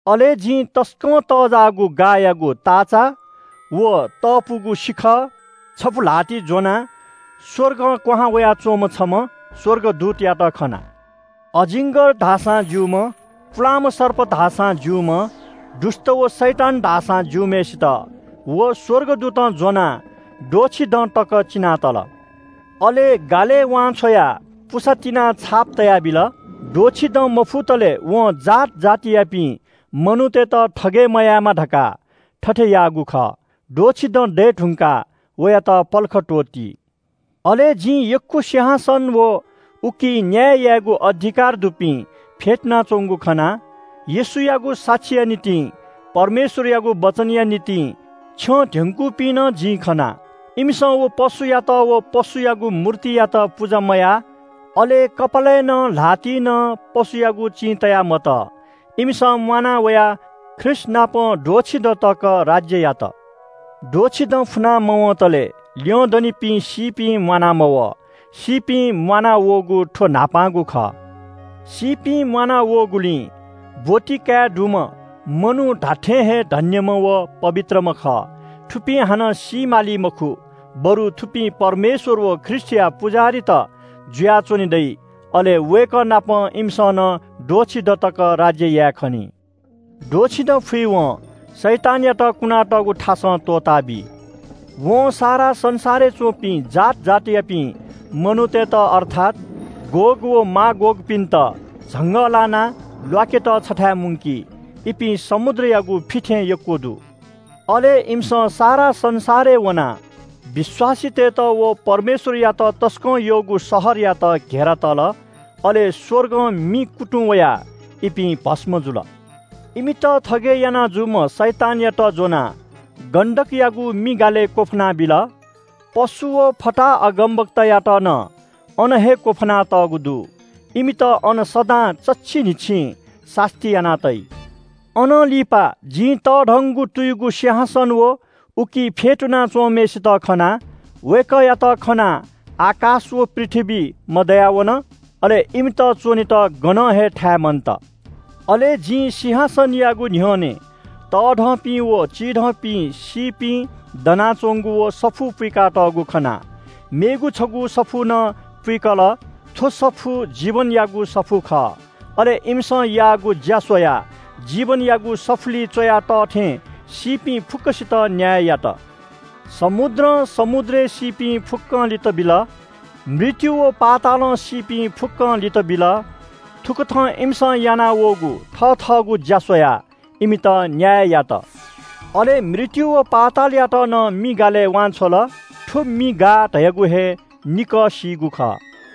अले जिं तसकं तःजाःगु गाःयागु ताःचा व तःपुगु सिखः छपु ल्‍हातिइ ज्‍वनाः स्‍वर्गं क्‍वहां वयाच्‍वंम्‍ह छम्‍ह स्‍वर्गदूतयात खना। अजिङ्‌गर धाःसां ज्‍यूम्‍ह, पुलांम्‍ह सर्प धाःसां ज्‍यूम्‍ह, दुष्‍ट व शैतान धाःसां ज्‍यूम्‍हय्‌सित व स्‍वर्गदूतं ज्‍वनाः द्वःछि दँ तक चिनातल। अले गालय् वान्‍छ्वयाः पुसा तिनाः छाप तयाबिल। द्वःछि दँ मफुतले वं जात जातियापिं मनूतय्‌त थगय् मयायेमा धकाः थथे याःगु खः। द्वःछि दँ दये धुंकाः वयात पलख त्‍वःती। अले जिं यक्‍व सिंहासन व उकी न्‍याय यायेगु अधिकार दुपिं फ्‍यतुनाच्‍वंगु खना। येशूयागु साक्षीया निंतिं, परमेश्‍वरयागु वचनया निंतिं छ्यं ध्‍यंकूपिं नं जिं खना। इमिसं व पशुयात व पशुयागु मूर्तियात पुजा मयाः, अले कपालय् नं, ल्‍हातिइ नं पशुयागु चिं तया मतः। इमिसं म्‍वाना वयाः ख्रीष्‍टनापं द्वःछि दँ तक राज्‍य यात। द्वःछि दँ फुना मवंतले ल्‍यंदनिपिं सीपिं म्‍वाना मवः, सीपिं म्‍वानावःगु थ्‍व न्‍हापांगु खः। सीपिं म्‍वाना वःगुली ब्‍वति काये दुम्‍ह मनू धात्‍थें हे धन्‍यम्‍ह व पवित्रम्‍ह खः। थुपिं हानं सी माली मखु, बरु थुपिं परमेश्‍वर व ख्रीष्‍टया पुजाहारीत जुयाच्‍वने दइ। अले वय्‌कः नाप इमिसं नं द्वःछि दँ तक राज्‍य याये खनी। द्वःछि दँ फुइवं शैतानयात कुना तःगु थासं त्‍वःताबी। वं सारा संसारय् च्‍वंपिं जात जातियापिं मनूतय्‌त अर्थात “गोग” व “मागोगपिन्‍त” झंगः लानाः ल्‍वाकेत छथाय् मुंकी। इपिं समुद्रयागु फि थें यक्‍व दु। अले इमिसं सारा संसारय् वनाः विश्‍वासीतय्‌त व परमेश्‍वरयात तसकं यःगु शहरयात घेरा तल। अले स्‍वर्गं मि कुतुं वयाः इपिं भस्‍म जुल। इमित थगय् याना जूम्‍ह शैतानयात ज्‍वनाः गन्‍धकयागु मि गालय् क्‍वफानाबिल। पशु व फताहा अगमवक्तायात नं अन हे क्‍वफाना तःगु दु। इमित अन सदां चच्‍छि न्‍हिच्‍छिं सास्‍ती याना तइ। अनं लिपा जिं तःधंगु तुयुगु सिंहासन व उकी फ्‍यतुना च्‍वंम्‍हय्‌सित खना। वय्‌कःयात खनाः आकाश व पृथ्‍वी मदयावन। अले इमित च्‍वनेत गनं हे थाय् मन्‍त। अले जिं सिंहासनयागु न्‍ह्यःने तःधंपिं व चिधंपिं सीपिं दनाच्‍वंगु व सफूत पुइकातःगु खना। मेगु छगू सफू नं पुइकल, थ्‍व सफू जीवनयागु सफू खः। अले इमिसं याःगु ज्‍या स्‍वयाः जीवनयागु सफुलिइ च्‍वया तः थें सीपिं फुक्‍कसित न्‍याय यात। समुद्रं समुद्रय् सीपिं फुक्‍कं लित बिल, मृत्‍यु व पातालं सीपिं फुक्‍कं लित बिल। थुकथं इमिसं यानावःगु थथःगु ज्‍या स्‍वयाः इमित न्‍याय यात। अले मृत्‍यु व पातालयात नं मि गालय् वांछ्वल। थ्‍व मि गाः धयागु हे निकः सीगु खः।